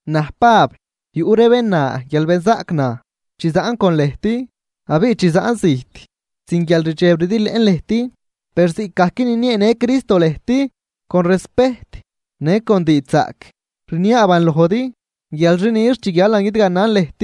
Naj Pab, yuꞌ ree bén na guial benzaꞌc naj chi zaꞌn con lëjt, abiꞌ chi zaꞌn zijt sin guial rdxeb rdiilëꞌn lëjt. Per ziꞌcgajc ninieenë Cristo lëjt con respejt në con diidxzaꞌc, rniaaban lojdi guial xi nix chi guialan guidganan lëjt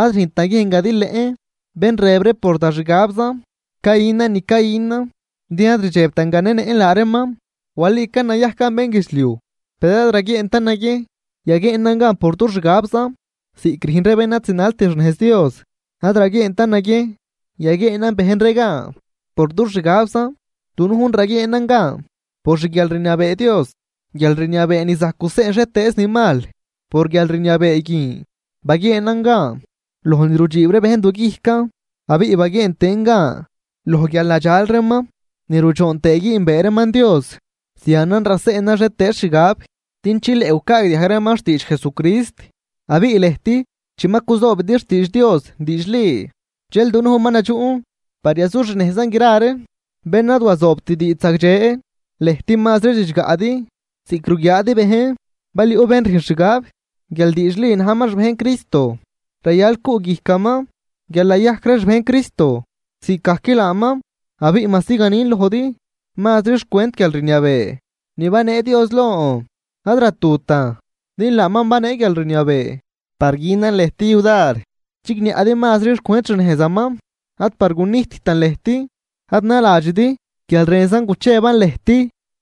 ad rüjnt naguiejn gadilëꞌn bén rëb ree por da xgabzan cayünan ni cayünan, din ad rdxebtan ganenëꞌn laa reeman. Walican nayajcan bénguidxliuj, per ad raguieentan naguiejn yaguieenan gan por dux xgabzan ziꞌc rüjn ree bén ad zinalt xnejz Dios. Ad raguieentan naguiejn yaguieenan bejn ree gan por dux xgabzan, dunujn raguieenan gan por xguialrniabee Dios, guialrniabee ni zajc guseꞌn xhietëëz ni mal. Por guialrniabee guin baguieenan gan loj ni rudxiib ree bejn duguijcan, abiꞌ baguieen tëën gan loj guial nadxal reeman ni rudxoon güünbee reeman Dios. Zianan raseꞌnan xhietëëz xgab din chileꞌ gucaagdiajg reeman xtiidx Jesucrist. Abiꞌ lëjt chi ma cuzoobidi xtiidx Dios diidxli, dxel dunujn ma nadxuꞌn par yazuxnejzan gra ree bén ad wazoobt diidx zagdxe. Lëjt mazri ridxgaꞌdi ziꞌc ruguiaadi bejn. Bal yuꞌ bén rüjn xgab guial diidxli najman xbejn Cristo, rayal cuꞌguijcaman guial nayajc ree xbejn Cristo ziꞌcgajc laaman. Abiꞌ majsi ganin lojdi mazri xcwent guialrniabee ni banee Dios lon, ad ratutan din laaman banee guialrniabee par günan lëjt yudar chigniaꞌdi mazri xcwent xnejzaman ad par gunijttan lëjt. Ad naladxidi guial rënzan gucheban lëjt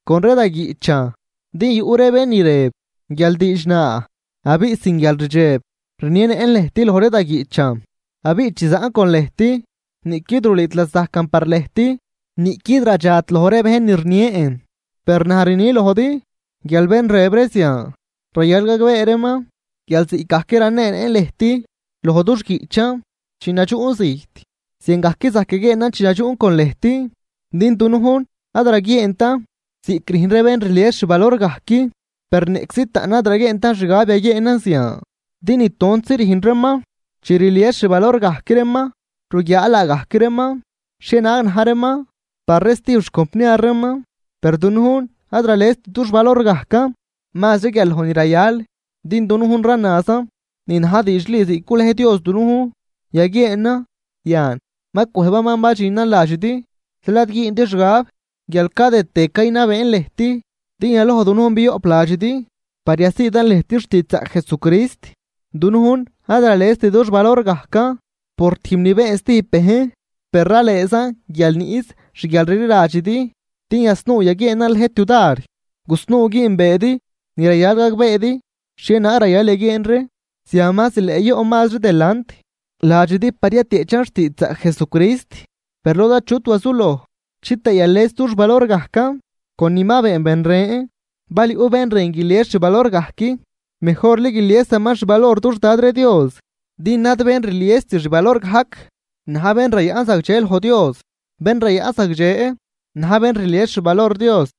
con ree da guiꞌchan. Din yuꞌ ree bén ni rëb guial diidx naa abiꞌ sin guialrdxeb rnienëꞌn lëjt loj ree da guiꞌchan, abiꞌ chi zaꞌn con lëjt niꞌquid rulüüt lasajcan par lëjt, niꞌquid radxat loj ree bejn ni rnien. Per naj rnin lojdi guial bén rëb ree zian rayal gagbee reeman guial ziꞌcgajc raneenëꞌn lëjt loj dux guiꞌchan chi nadxuꞌn zijt, ziangajc zajc yaguieenan chi nadxuꞌn con lëjt. Din dunujn ad raguieentan ziꞌc rüjn ree bén rlies xvalor gajc, per niꞌczi taꞌn ad raguieentan xgab yaguieenan zian. Din nitontzi rüjn reeman chi rlies xvalor gajc reeman, ruguiaa laagajc reeman xhienaag na̱j reeman par ree stijb xcompniar reeman. Per dunujn ad ralest dux valor gajcan mazri guial loj ni rayal, din dunujn ranazan ni na̱j diidxli ziꞌc gulej Dios dunujn yaguieenan, yan ma cwëjbaman badxinan ladxidi. Zeel ad güündi xgab guial cadëdtë caynabeen lëjt, din yaloj dunujn bioꞌp ladxidi par yasiidan lëjt xtiidxzaꞌc Jesucrist. Dunujn ad ralest dux valor gajcan por tijb ni been stijb bejn. Per ralëëzan guial niꞌs xguialrliladxidi, din yasnuu yaguieenan lëjt yudar gusnuu güünbeedi ni rayal gagbeedi xhienaag rayal yaguieen ree. Zian ma zileꞌ yoꞌn mazri delant ladxidi par yatieꞌchan xtiidxzaꞌc Jesucrist, per lod achut wazuloj chitëë yales dux valor gajcan con ni ma been ben ren. Bal yuꞌ bén rën guilies xvalor gajc, mejorli guiliesaman xvalor dux Dad ree Dios. Din ad bén rliest xvalor gajc na̱j bén rayaꞌn zagdxe loj Dios, bén rayaꞌn zagdxe na̱j bén rlies xvalor Dios.